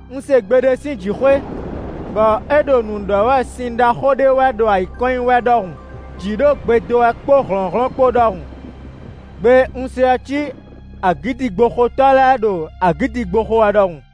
Un se gbe ɖé sín jǐxwé bɔ é ɖo nǔ ɖɔ wɛ sin ɖaxó ɖé wɛ ɖo ayǐ kɔn nyi wɛ ɖɔhun; jǐ ɖo gbe dó wɛ kpó hlɔ̌nhlɔ́n kpó ɖɔhun; gbe e un se ɔ́ cí agǐdigboxotɔ́ lɛ́ɛ ɖo agǐdigbo xo wɛ ɖɔhun.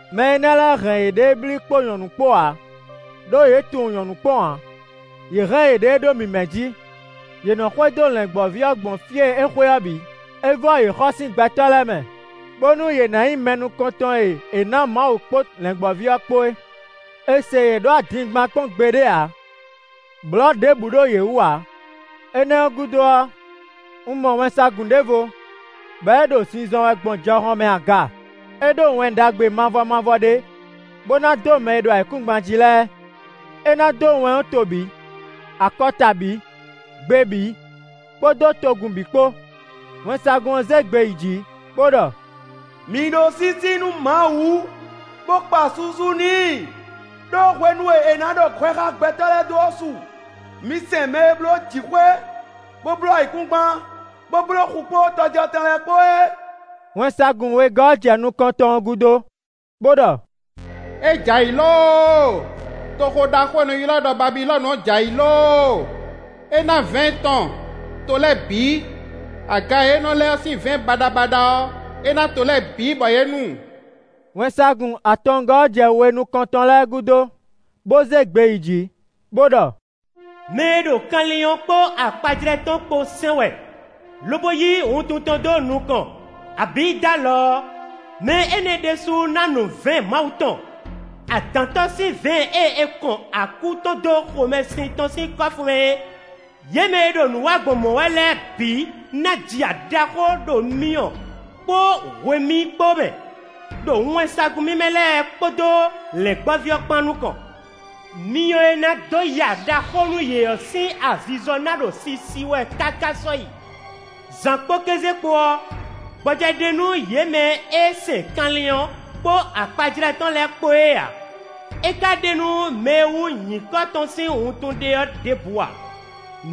Mɛ énɛ́ lɛ́ɛ hɛn yěɖée blí kpó nyɔ̌nu kpó ǎ; ɖó yě tunwun nyɔ̌nu kpɔ́n ǎ; yě hɛn yěɖée ɖó mǐmɛ́ jí; yě nɔ xwedó Lɛ̌ngbɔ́ví ɔ́ gbɔn fí e é xwe ɔ́ bǐ; é vɔ́ yě xɔ sín gbɛtɔ́ lɛ́ɛ mɛ, bónú yě ná nyí mɛ nukɔntɔn e è nǎ Mawu kpó Lɛ̌ngbɔ́ví ɔ́ kpó é. È se yě ɖó adingban kpɔ́n gbeɖé ǎ; blɔ̌ ɖěbǔ ɖo yě wú ǎ. Énɛ́ ɔ́ gúdo ɔ́, un mɔ wɛnsagun ɖěvo, bɔ é ɖo zinzɔn wɛ gbɔn jɔhɔn mɛ aga; é ɖó Wɛn Ɖagbe mavɔ mavɔ ɖé bó ná dó mɛ e ɖo ayǐkúngban jí lɛ́ɛ; é ná dó wɛn ɔ́ to bǐ, akɔta bǐ, gbe bǐ kpódó togun bǐ kpó. Wɛnsagun ɔ́ zé gbe yi jǐ bó ɖɔ: “Mi ɖó sísí nú Mawu, bó kpa susu n'i! Đó hwenu e é ná ɖɔ hwɛ xá gbɛtɔ́ lɛ́ɛ dó ɔ́ su. Mi sɛn mɛ e bló jǐxwé, bó bló ayǐkúngban, bó bló xu kpó tɔjɔtɛn lɛ́ɛ kpó é!” Wɛnsagun wegɔ́ ɔ́ jɛ nukɔntɔn ɔ́ gúdo, bó ɖɔ: “É jɛ ayǐ lóóo! Toxo ɖaxó e è nɔ ylɔ́ ɖɔ Babilɔ́nu ɔ́ jɛ ayǐ lóóo. É ná vɛ̌ɛn tɔn to lɛ́ɛ bǐ. Aga e é lɛ ɔ́ sín vɛ̌ɛn baɖabaɖa ɔ́, é ná to lɛ́ɛ bǐ bɔ yě nu!” Wɛnsagun atɔngɔ́ ɔ́ jɛ we nukɔntɔn lɛ́ɛ gúdo, bó zé gbe yi jǐ bó ɖɔ: “Mɛ e ɖo kanlin ɔ́ kpó akpajlɛ́ tɔn kpó sɛn wɛ, lobo yí wuntun tɔn dó nukɔn, abǐ dó alɔ ɔ́, mɛ énɛ́ ɖésú ná nu vɛ̌ɛn Mawu tɔn; adǎn tɔn sín vɛ̌ɛn e é kɔn akú tɔn dó xomɛsin tɔn sín kɔ́fu mɛ é! Yě mɛ e ɖo nǔ wa gbɔn mɔ̌ wɛ lɛ́ɛ bǐ ná ji ya ɖaxó, ɖo myɔ kpó hwemí kpó mɛ, ɖo wɛnsagun mímɛ́ lɛ́ɛ kpódó Lɛ̌ngbɔ́ví ɔ́ kpán nukɔn. Myɔ e ná dó ya ɖaxó nú yě ɔ́ sín azizɔ ná ɖo sisi wɛ káká sɔ́yi. Zǎn kpó kéze kpó ɔ́, gbɔjɛ́ ɖe nú yě mɛ e sɛn kanlin ɔ́ kpó akpajlɛ́ tɔn lɛ́ɛ kpó é ǎ; é ka ɖe nú mɛ e wú nyǐkɔ tɔn sín wuntun ɖe ɔ́ ɖěbǔ ǎ.”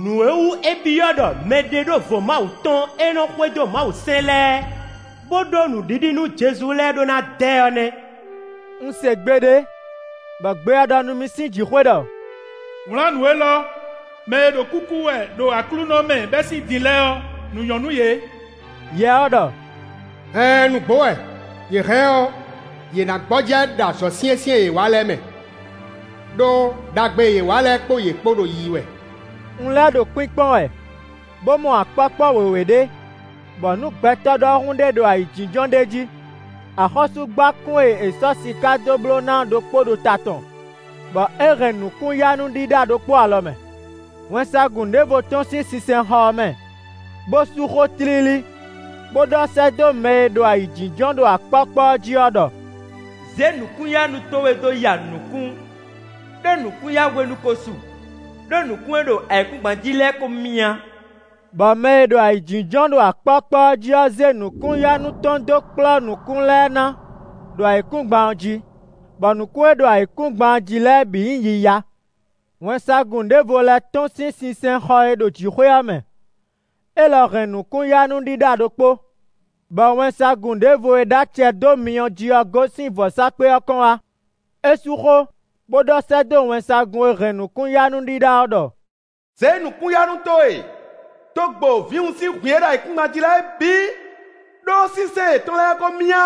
Nǔ e wú é byɔ́ ɖɔ mɛɖeɖóvo Mawu tɔn e nɔ xwedó Mawusɛ́n lɛ́ɛ, bó ɖó nǔɖiɖi nú Jezu lɛ́ɛ ɖó ná dɛ ɔ́ nɛ́. Un se gbe ɖé bɔ gbe ɔ́ ɖɔ nú mì sín jǐxwé ɖɔ: “Wlǎn nǔ élɔ́: ‘Mɛ e ɖo kúkú wɛ ɖo Aklúnɔ mɛ bɛ́ sín din lɛ́ɛ ɔ́, nǔ nyɔ́ nú yě!’” Yɛ ɔ́ ɖɔ: “Ɛɛn nǔgbó wɛ, yě hɛn ɔ́, yě ná gbɔjɛ́ ɖo azɔ̌ syɛ́nsyɛ́n e yě wa lɛ́ɛ mɛ, ɖó ɖagbe e yě wa lɛ́ɛ kpó yě kpo ɖo yiyi wɛ.” Un lɛ́ ɖo kpínkpɔ́n wɛ bó mɔ akpɔ́kpɔ́ wěwé ɖé, bɔ nǔ gbɛtɔ́ ɖɔhun ɖé ɖo ayǐjínjɔ́n ɖ'é jí. Axɔ́súgbákún e è sɔ́ siká dó bló ná ɔ́ ɖokpó ɖo ta tɔn, bɔ é hɛn nǔkún-yanú ɖíɖá ɖokpó alɔ mɛ. Wɛnsagun ɖěvo tɔ́n sín sinsɛnxɔ ɔ́ mɛ, bó sú xó tlílí, bó ɖɔ sɛ́ dó mɛ e ɖo ayǐjínjɔ́n ɖo akpɔ́kpɔ́ ɔ́ jí ɔ́ ɖɔ: “Zě nǔkún-yanú towe dó ya nǔkún, ɖó nǔkún-yahwenu ko su; ɖó nǔkún e ɖo ayǐkúngban jí lɛ́ɛ ko myá.” Bɔ mɛ e ɖo ayǐjínjɔ́n ɖo akpɔ́kpɔ́ ɔ́ jí ɔ́ zé nǔkún-yanú tɔn dó kplɔ́ nǔkún lɛ́ɛ ná ɖo ayǐkúngban ɔ́ jí; bɔ nǔkún e ɖo ayǐkúngban jí lɛ́ɛ bǐ nyí yiya. Wɛnsagun ɖěvo lɛ́ tɔ́n sín sinsɛnxɔ e ɖo jǐxwé ɔ́ mɛ; élɔ́ hɛn nǔkún-yanú ɖíɖá ɖokpó. Bɔ wɛnsagun ɖěvo e ɖó acɛ dó myɔ ɔ́ jí ɔ́ gosín vɔ̌sákpe ɔ́ kɔn wá. É sú xó, bó ɖɔ sɛ́ dó wɛnsagun e hɛn nǔkún-yanú ɖíɖá ɔ́ ɖɔ: “Zě nǔkún-yanú towe dó gbo vǐwun sín hwǐn e ɖo ayǐkúngban jí lɛ́ɛ bǐ; ɖó sínsɛ́n yětɔn lɛ́ɛ ko myá.”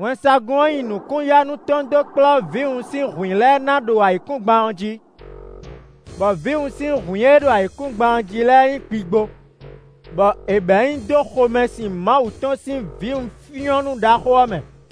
Wɛnsagun ɔ́ nyi nǔkún-yanú tɔn dó kplɔ́ vǐwun sín hwǐn lɛ́ɛ ná ɖo ayǐkúngban ɔ́ jí, bɔ vǐwun sín hwǐn e ɖo ayǐkúngban jí lɛ́ɛ nyí gbigbo, bɔ è bɛ̌ nyi dó xomɛsin Mawu tɔn sín vǐwunfyɔ́nnú ɖaxó ɔ́ mɛ.